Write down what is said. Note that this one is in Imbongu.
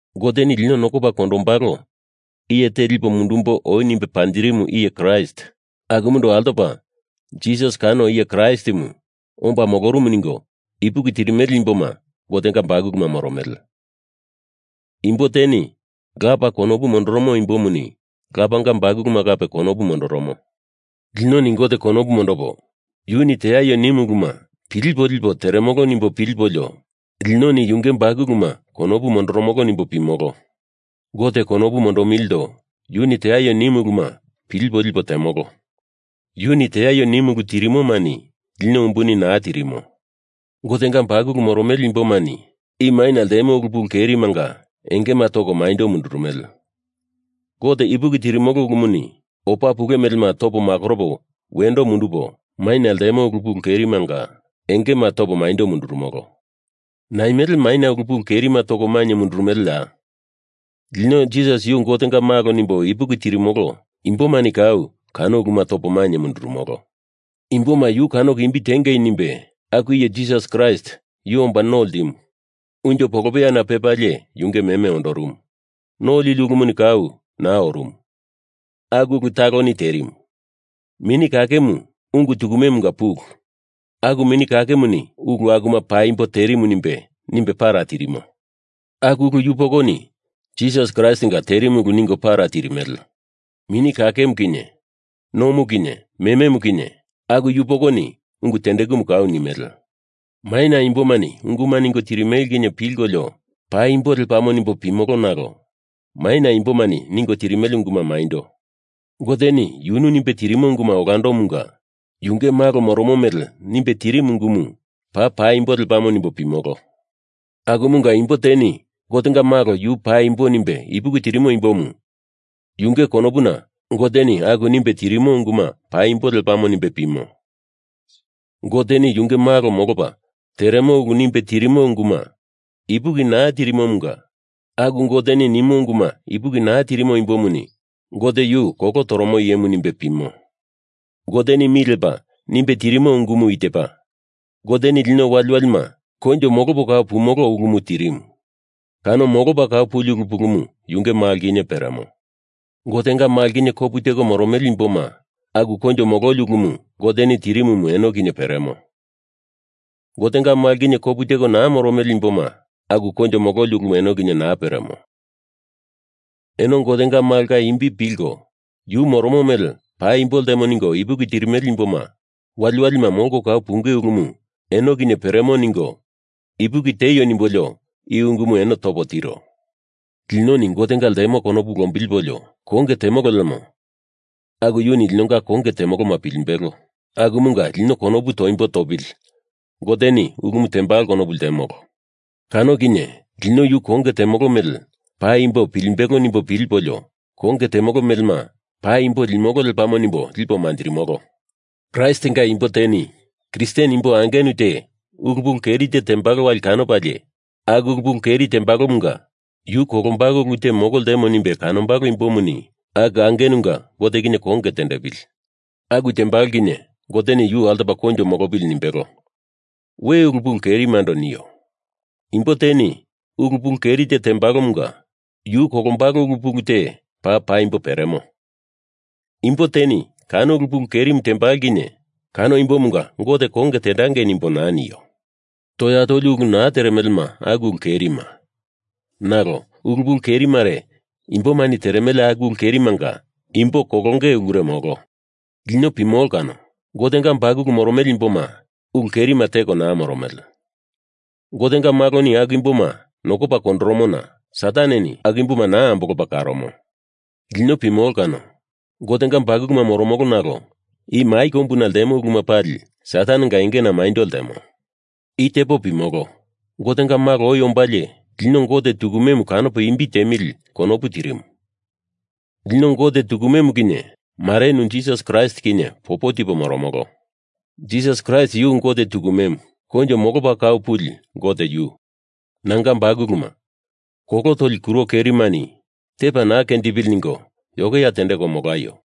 Goteni lino nokopa kondombalo iye te lipo mundumbo oi nimbe panjirimu iye Kraist akumundo altopa Jisas kano iye Kraistimu omba molorumu ningo ipuki tirimele imboma Gotenga bakuluma moromele. Imbo teni Lapa konopu mondoromo imbomuni Lapanga bakuluma kape konopu mondoromo. Linoni Gote konopu mondopo, Yuni teaio nimu uluma pilipo lipo teremolo nimbo pilipolio linoni yunge bakuluma konopu mondoromolo nimbo pimolo. Gote konopu mondomilindo yuni teaio nimu uluma pilipo lipo temolo. Yuni teaio nimu ulu tirimomani lino umbuni naa tirimo. Gotenga bakulu moromele imbomani i maina ltemo ulu pulu kerimanga engema toko maindo mundurumele. Gote ipuki tirimolo ulumuni opa pule melema topo makoropo wendo mundupo maina ltemo ulu pulu kerimanga engema topo maindo mundurumolo. Naimele maina ulu pulu kerima toko mainye mundurumeleya? Lino Jisas yu Gotenga Malo nimbo ipuki tirimolo imbomani kau kano uluma topo mainye mundurumolo. Imboma yu kanoko imbi tiengei nimbe aku iye Jisas Kraist yu omba no ltimu, unjo polopeyana pepalie yunge meme ondorumu. No lili ulumuni kau naa orumu. Aku ulu taloni terimu. Mini Kakemu ungu tukumemunga pulu, aku Mini Kakemuni ulu akuma paimbo terimu nimbe, nimbe para tirimo. Aku ulu yupokoni Jisas Kraistinga terimu ulu ningo para tirimele. Mini Kakemu kinye nomu kinye mememu kinye, aku yupokoni ungu tendekumu kau nimele. Maina imbomani unguma ningo tirimele kinye pilipolio paimbo lepamo nimbo pimolo nalo maina imbomani ningo tirimele unguma maindo. Goteni yunu nimbe tirimo unguma olandomunga yunge Malo moromo mele nimbe tirimu ungumu paa paimbo lepamo nimbo pimolo. Akumunga imbo teni Gotenga Malo yu paimbo nimbe ipuki tirimo imbomu yunge konopuna Goteni aku nimbe tirimo unguma paimbo lepamo nimbe pimo. Goteni yunge Malo molopa teremo ulu nimbe tirimo unguma ipuki naa tirimomunga aku Goteni nimo unguma ipuki naa tirimo imbomuni Gote yu kolo toromo iyemu nimbe pimo. Goteni mi lepa nimbe tirimo ungumu i tepa: Goteni lino waliwalima koinjo molopo kau pumolo ulumu tirimu. Kano molopa kau puli ulu pulumu yunge Malo kinye peremo. Gotenga Malo kinye kopu teko moromele imboma aku koinjo mololi ulumu Goteni tirimumu eno kinye peremo. Gotenga Malo kinye kopu teko naa moromele imboma aku koinjo mololi ulumu eno kinye naa peremo. Eno Gotenga Malonga imbi pilko yu moromo mele paimbo ltemo ningo ipuki tirimele imboma waliwalima molko kau punge ulumu eno kinye peremo ningo ipuki tieio nimbolio i ungumu eno topo tiro. Linoni Gotenga ltemo konopu lombilipolio konge temolo lemo aku yuni linonga konge temoloma pilimbelo. Akumunga lino konopu toimbo topili Goteni ulumu tembalo konopu ltemolo. Kano kinye lino yu konge temolo mele paimbo pilimbelo nimbo pilipolio konge temolo melema paimbo limolo lepamo nimbo lipo manjirimolo. Kraistinga imbo teni Kristen imbo angenu te ulu pulu keri te tembalo wali kanopalie aku ulu pulu keri tembalomunga yu kolombalo ulu te molo ltemo nimbe kanombalo imbomuni aku angenunga Gote kinye konge tendepili! Aku tembalo kinye Goteni yu altopa koinjo molopili nimbelo. We ulu pulu kerimando nio. Imbo teni ulu pulu keri te tembalomunga yu kolombalo ulu pulu te paa paimbo peremo. Imbo teni kano ulu pulu kerimu tembalo kinye kano imbomunga Gote konge tendangei nimbo naa nio. Toya toli ulu naa teremelema aku ulu kerima. Nalo ulu pulu keri mare imbomani teremele aku ulu kerimanga imbo kolonge ulure molo. Lino pimolo kano: Gotenga bakulu moromele imboma ulu kerima teko naa moromele. Gotenga Maloni aku imboma nokopa kondoromona Sataneni aku imboma naa ambolopa karomo. Lino pimolo kano: Gotenga bakuluma moromolo nalo i mai kombuna ltemo uluma pali Satanenga engena maindo ltemo. I tepo pimolo: Gotenga Malo oi ombalie lino Gote Tukumemu kanopo imbi tiemili konopu tirimu. Lino Gote Tukumemu kinye Marenu Jisas Kraist kinye popo tipo moromolo. Jisas Kraist yu Gote Tukumemu, koinjo molopa kau puli Gote yu. Nanga bakuluma, kolo toli kuro kerimani tepa naa kenjipili ningo yokeya tendeko molaio.